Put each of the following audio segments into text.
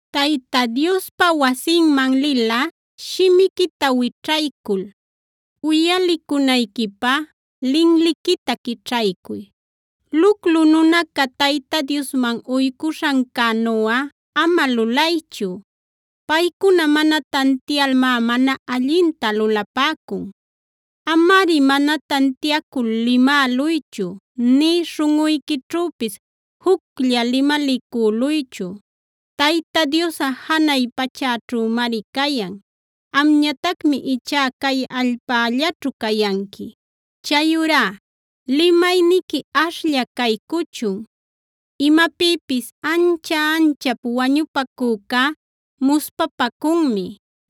Tayta Diospa wasinman lilꞌa shimiquita wićhaycul uyalicunayquipä linliquita quićhaycuy. Luclu nunaca Tayta Diosman uycuśhancänuꞌa ama lulaychu; paycuna mana tantialmá mana allinta lulapäcun. Amari mana tantiacul limäluychu, nï śhunꞌuyquićhüpis juclla limalicüluychu; Tayta Diosꞌa janay pachäćhümari cayan; amñatacmi ichá cay allpällaćhu cayanqui. Chayurá limayniqui ashlla caycuchun. Imapïpis ancha-anchap wañupacücá muspapacunmi;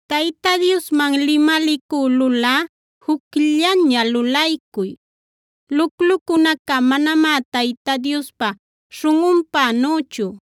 Tayta Diosman limalicülulꞌa jucllaña lulaycuy; luclucunaca manamá Tayta Diospa śhunꞌunpänüchu.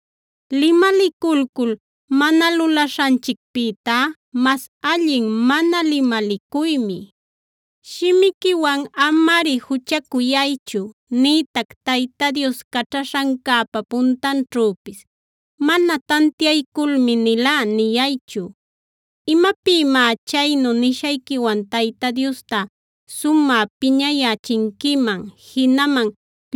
Limaliculcul mana lulaśhanchicpïtá mas allin mana limalicuymi. Shimiquiwan amari juchacuyaychu nïtac Tayta Dios caćhaśhancäpa puntanćhüpis “mana tantiayculmi nilá” niyaychu. ¿Imapïmá chaynu nishayquiwan Tayta Diosta sumä piñayächinquiman, jinaman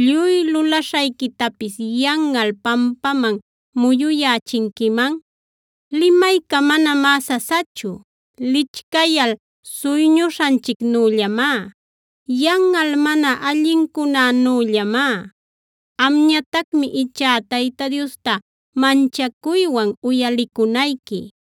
lluy lulaśhayquitapis yanꞌal pampaman muyuyächinquiman? Limayca manamá sasachu, lichcayal suyñuśhanchicnüllamá, yanꞌal mana allincunänüllamá. Amñatacmi ichá Tayta Diosta manchacuywan uyalicunayqui.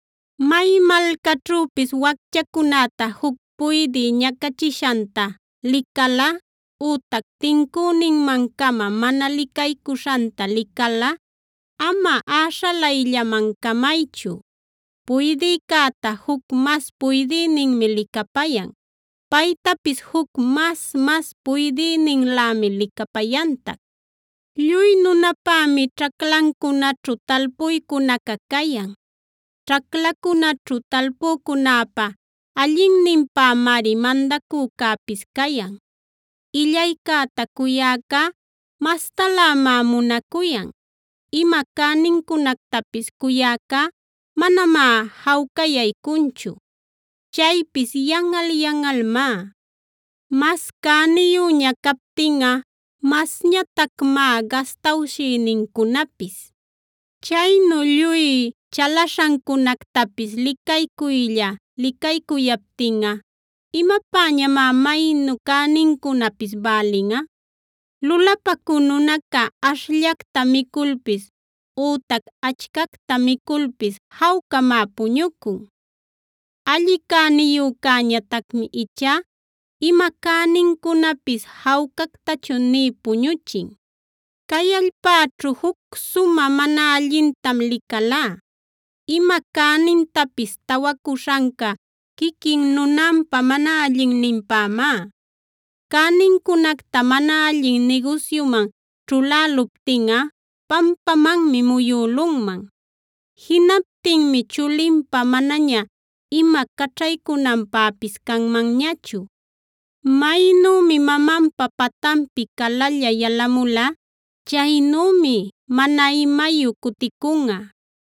May malcaćhüpis wacchacunäta juc puydï ñacachishanta licalꞌa ütac tincüninman-cama mana licaycuśhanta licalꞌa ama äśhalayllaman camaychu. Puydïcäta juc mas puydïninmi licapayan; paytapis juc mas-mas puydïninlämi licapayantac. Lluy nunapämi ćhaclacunäćhu talpuycunaca cayan; ćhaclacunaćhu talpücunäpa allinninpämari mandacücäpis cayan. Illaycäta cuyäcá mastalämá munacuyan; ima cänincunactapis cuyäcá manamá jawcayaycunchu. Chaypis yanꞌal-yanꞌalmá. Mas cäniyüña captinꞌa masñatacmá gastawshïnincunapis. Chaynu lluy chalaśhancunactapis licaycuylla licaycuyaptinꞌa ¿imapäñamá maynu cänincunapis bälinꞌa? Lulapacü nunaca ashllacta miculpis ütac achcacta miculpis jawcamá puñucun. Alli cäniyücätañatacmi ichá ima cänincunapis jawcactachu nï puñuchin. Cay allpäćhu juc sumä mana allintam licalá. Ima cänintapis tawacuśhanca quiquin nunanpa mana allinninpämá. Cänincunacta mana allin nigusyuman ćhuläluptinꞌa pampamanmi muyülunman. Jinaptinmi chulinpä manaña ima caćhaycunanpäpis canmanñachu. Maynümi mamanpa patanpi calalla yalamula, chaynümi mana imayu cuticunꞌa.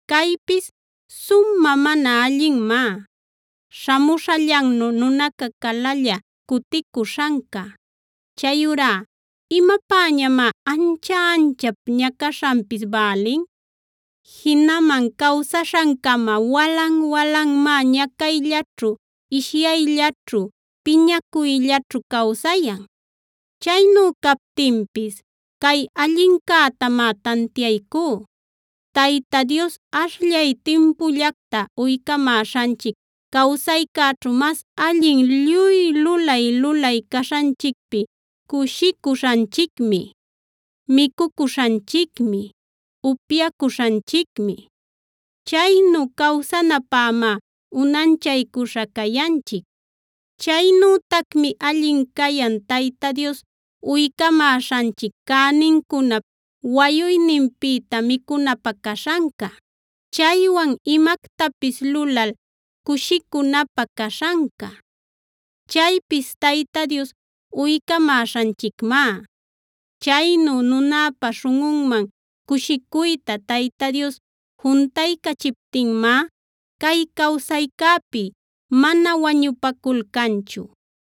Caypis sumä mana allinmá: śhamuśhallannu nunaca calalla cuticuśhanca. Chayurá ¿imapäñamá ancha-anchap ñacaśhanpis bälin? Jinaman cawsaśhancama walan-walanmá ñacayllaćhu, ishyayllaćhu, piñacuyllaćhu cawsayan. Chaynu captinpis cay allincätamá tantiaycú: Tayta Dios ashllay timpullacta uycamäśhanchic cawsaycäćhu mas allin lluy lulay-lulay caśhanchicpi cushicuśhanchicmi, micucuśhanchicmi, upyacuśhanchicmi. Chaynu cawsanapämá unanchaycuśha cayanchic. Chaynütacmi allin cayan Tayta Dios uycamäśhanchic cänincunap wayuyninpïta micunapä caśhanca; chaywan imactapis lulal cushicunapä caśhanca. Chaypis Tayta Dios uycamäśhanchicmá. Chaynu nunäpa śhunꞌunman cushicuyta Tayta Dios juntaycachiptinmá cay cawsaycäpi mana wañupaculcanchu.